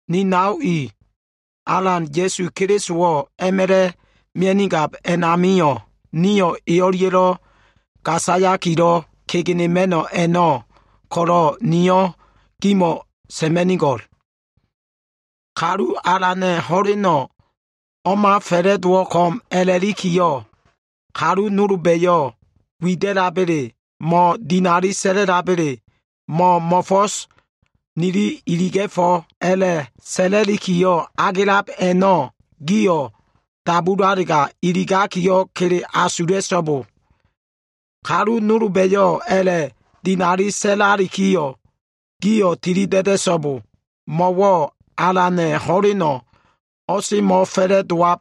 Ni nao i, Alan Ya꞉su Kelisowo꞉ a꞉ma꞉la꞉ mia꞉nigab a꞉namio꞉, nio꞉ e o꞉lia꞉lo꞉ gasayakilo꞉ kegenema꞉no꞉ a꞉no꞉ ko꞉lo꞉, niyo꞉ gimo꞉wo꞉ sa꞉ma꞉nigo꞉l. Kalu Alana꞉ ho꞉leno꞉ o꞉ma fa꞉la꞉dowo꞉ ko꞉m a꞉la꞉likiyo꞉, kalu nolba꞉yo꞉ wida꞉laba꞉le, mo꞉dinali sa꞉la꞉labele, mo꞉ mo꞉fo꞉so꞉ nili iliga꞉fo꞉ka꞉ a꞉la꞉ sa꞉la꞉likilo꞉ agelab a꞉no꞉, gio꞉ dabulalega, iligakiyo꞉ kele asula꞉so꞉bo. Kalu nolba꞉yo꞉ a꞉la꞉dinali sa꞉lalikiyo꞉ gio꞉ tilida꞉da꞉so꞉bo. Mo꞉wo꞉ Alana꞉ ho꞉leno꞉ o꞉semo꞉fa꞉la꞉dowab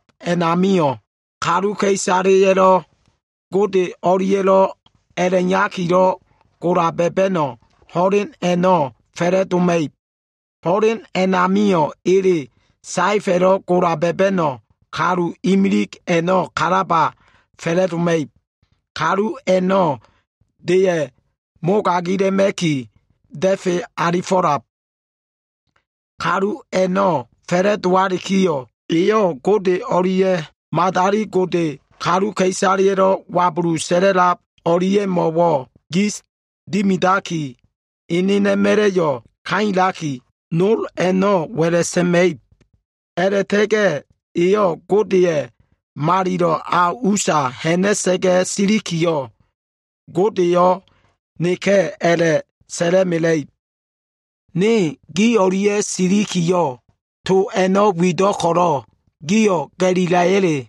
amio꞉ kaluka꞉isaleya꞉lo꞉ Gode o꞉lia꞉lo꞉ a꞉la꞉iyakilo꞉ gola ba꞉ba꞉no꞉ ho꞉len a꞉no꞉ fa꞉la꞉doma꞉ib. Ho꞉len a꞉namio꞉ ele saefa꞉lo꞉ gola ba꞉ba꞉no꞉ kalu imilig a꞉no꞉ kalaba fa꞉la꞉doma꞉ib. Kalu a꞉no꞉ deya꞉ mogagila꞉ma꞉ki da꞉fe alifo꞉lab. Kalu a꞉no꞉ fa꞉la꞉dowalikiyo꞉, eyo꞉ Gode o꞉lia꞉ madali gode kaluka꞉isaleya꞉lo꞉ wabulu sa꞉la꞉lab o꞉lia꞉mo꞉wo꞉ gis dimidaki, enena꞉ma꞉la꞉yo꞉ kailaki, nol a꞉no꞉ wa꞉la꞉ sa꞉ma꞉ib. A꞉la꞉ta꞉ga꞉ eyo꞉ Godeya꞉ malilo꞉ a usa ha꞉na꞉sa꞉ga꞉ silikiyo꞉, “Godeleyo꞉ neka꞉” a꞉la꞉sa꞉la꞉mela꞉ib. Ne gi o꞉lia꞉ silikiyo꞉, to a꞉no꞉ wido꞉ ko꞉lo꞉ gio꞉ ga꞉lila꞉ya꞉le?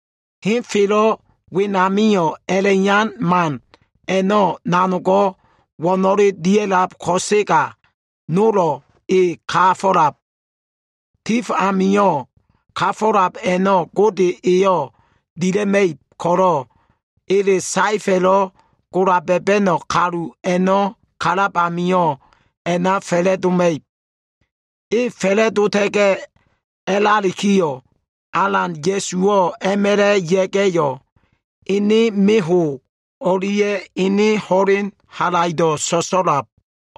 Henfelo꞉ wenamio꞉ a꞉la꞉iyan man a꞉no꞉ nanogo꞉ wo꞉no꞉lebo꞉ dia꞉lab ko꞉sega, nolo꞉ e ka꞉la꞉lab. Tif amio꞉ kafo꞉lab a꞉no꞉ Gode eyo꞉ dila꞉ma꞉ib ko꞉lo꞉, ele saefa꞉lo꞉ gola ba꞉ba꞉no꞉ kalu a꞉no꞉ kalab amio꞉ a꞉na fa꞉la꞉doma꞉ib. E fa꞉la꞉dota꞉ga꞉ a꞉lalikiyo꞉, Alan Ya꞉suwo꞉ a꞉ma꞉la꞉ ya꞉ga꞉yo꞉, ene meho꞉ o꞉lia꞉ ene ho꞉len halaido꞉ so꞉so꞉idab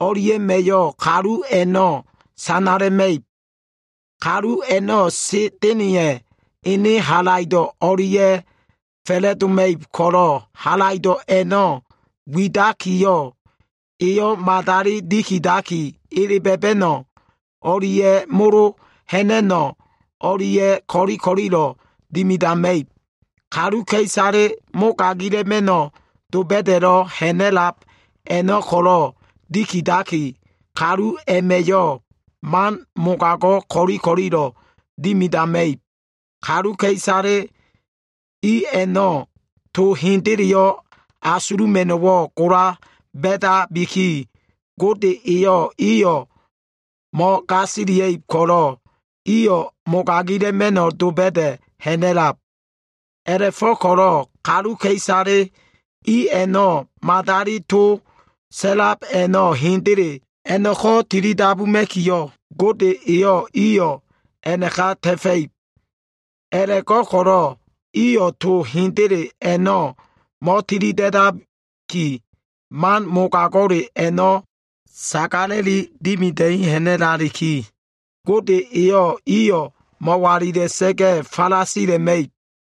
o꞉lia꞉ma꞉yo꞉ kalu a꞉no꞉ sanala꞉ma꞉ib. Kalu a꞉no꞉, Sa꞉da꞉na꞉ya꞉ ene halaido꞉ o꞉lia꞉ fa꞉la꞉doma꞉ib ko꞉lo꞉ halaido꞉ a꞉no꞉ widakiyo꞉, eyo꞉ madali dikidaki, ele ba꞉ba꞉no꞉ o꞉lia꞉ molo ha꞉na꞉no꞉ o꞉lia꞉ ko꞉li ko꞉lilo꞉ dimidama꞉ib. Kaluka꞉isale mogagila꞉ma꞉no꞉ doba꞉da꞉lo꞉ ha꞉na꞉lab a꞉no꞉ ko꞉lo꞉ dikidaki, kalu a꞉ma꞉yo꞉ man mogago꞉ ko꞉li ko꞉lilo꞉ dimidama꞉ib. Kaluka꞉isale i a꞉no꞉ to hendeleyo꞉ asuluma꞉no꞉wo꞉ gola ba꞉dabiki, Gode eyo꞉ iyo꞉ mo꞉gasiliab ko꞉lo꞉ iyo꞉ mogagila꞉ma꞉no꞉ doba꞉da꞉ ha꞉na꞉lab. A꞉la꞉fo꞉ko꞉lo꞉ kaluka꞉isale i a꞉no꞉ madali to sa꞉lab a꞉no꞉ hendele a꞉no꞉ko꞉ tilidabuma꞉kiyo꞉, Gode eyo꞉ iyo꞉ a꞉naka ta꞉fa꞉ib. A꞉la꞉go꞉ko꞉lo꞉ iyo꞉ to hendele a꞉no꞉ mo꞉tilida꞉daki, man mogago꞉le a꞉no꞉ sagala꞉li dimida꞉i ha꞉na꞉laliki, Gode eyo꞉ iyo꞉ mo꞉walila꞉sa꞉ga꞉ falasila꞉ma꞉ib.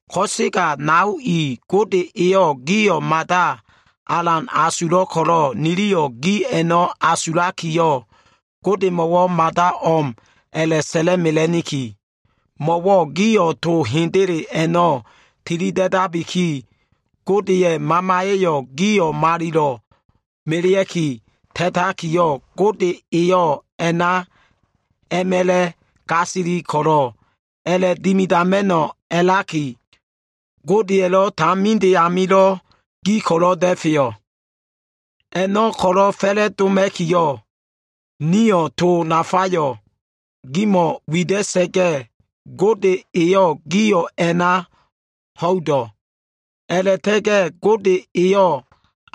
Ko꞉sega nao i, Gode eyo꞉ gio꞉ mada alan asulo꞉ ko꞉lo꞉ niliyo꞉ gi a꞉no꞉ asulakiyo꞉, Godemo꞉wo꞉ mada o꞉m a꞉la꞉sa꞉la꞉mela꞉niki. Mo꞉wo꞉ gio꞉ to hendele a꞉no꞉ tilida꞉dabiki, Godeya꞉ Mamaya꞉yo꞉ gio꞉ malilo꞉ melea꞉ki ta꞉takiyo꞉, Gode eyo꞉ a꞉na a꞉ma꞉la꞉ gasili ko꞉lo꞉, a꞉la꞉dimidama꞉no꞉ a꞉laki, Godeya꞉lo꞉ taminde amio꞉ gi ko꞉lo꞉ da꞉feyo꞉. A꞉no꞉ ko꞉lo꞉ fa꞉la꞉doma꞉kiyo꞉, nio꞉ to nafayo꞉ gimo꞉ wida꞉sa꞉ga꞉, Gode eyo꞉ gio꞉ a꞉na ho꞉ido꞉. A꞉la꞉ta꞉ga꞉ Gode eyo꞉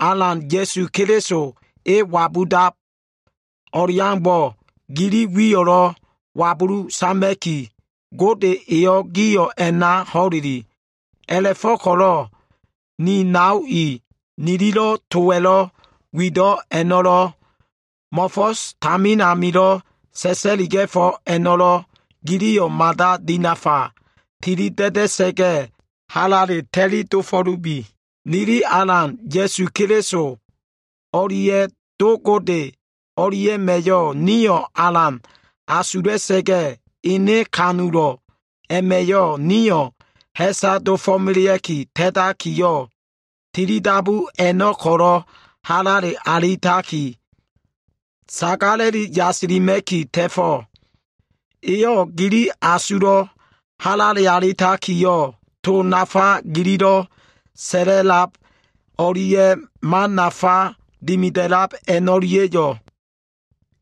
Alan Ya꞉su Keliso E wabudab o꞉leaumbo꞉, gili wiyo꞉lo꞉ wabulu sama꞉ki, Gode eyo꞉ gio꞉ a꞉na ho꞉leli. A꞉la꞉fo꞉ko꞉lo꞉ ni nao i, nililo꞉ towa꞉lo꞉ wido꞉ a꞉no꞉lo꞉, mo꞉fo꞉s tamin amilo꞉ sa꞉sa꞉liga꞉fo꞉ a꞉no꞉lo꞉, giliyo꞉ mada dinafa tilida꞉da꞉sa꞉ga꞉, halale ta꞉li dofo꞉lubi. Nili Alan Ya꞉su Keliso o꞉lia꞉ Do Gode o꞉lia꞉ma꞉yo꞉ nio꞉ alan asula꞉sa꞉ga꞉, ene kanulo꞉ a꞉ma꞉yo꞉ nio꞉ ha꞉sa dofo꞉melea꞉ki ta꞉takiyo꞉, tilidabu a꞉no꞉ ko꞉lo꞉ halale alitaki, sagala꞉li yasilima꞉ki ta꞉fo꞉. Eyo꞉ gili asulo꞉wo꞉ halale alitakiyo꞉, to nafa gililo꞉ sa꞉la꞉lab o꞉lia꞉ man nafa dimida꞉lab a꞉no꞉lia꞉yo꞉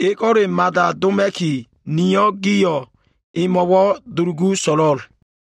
ego꞉le mada doma꞉ki, niyo꞉ gio꞉ emo꞉wo꞉ dulugu so꞉lo꞉l.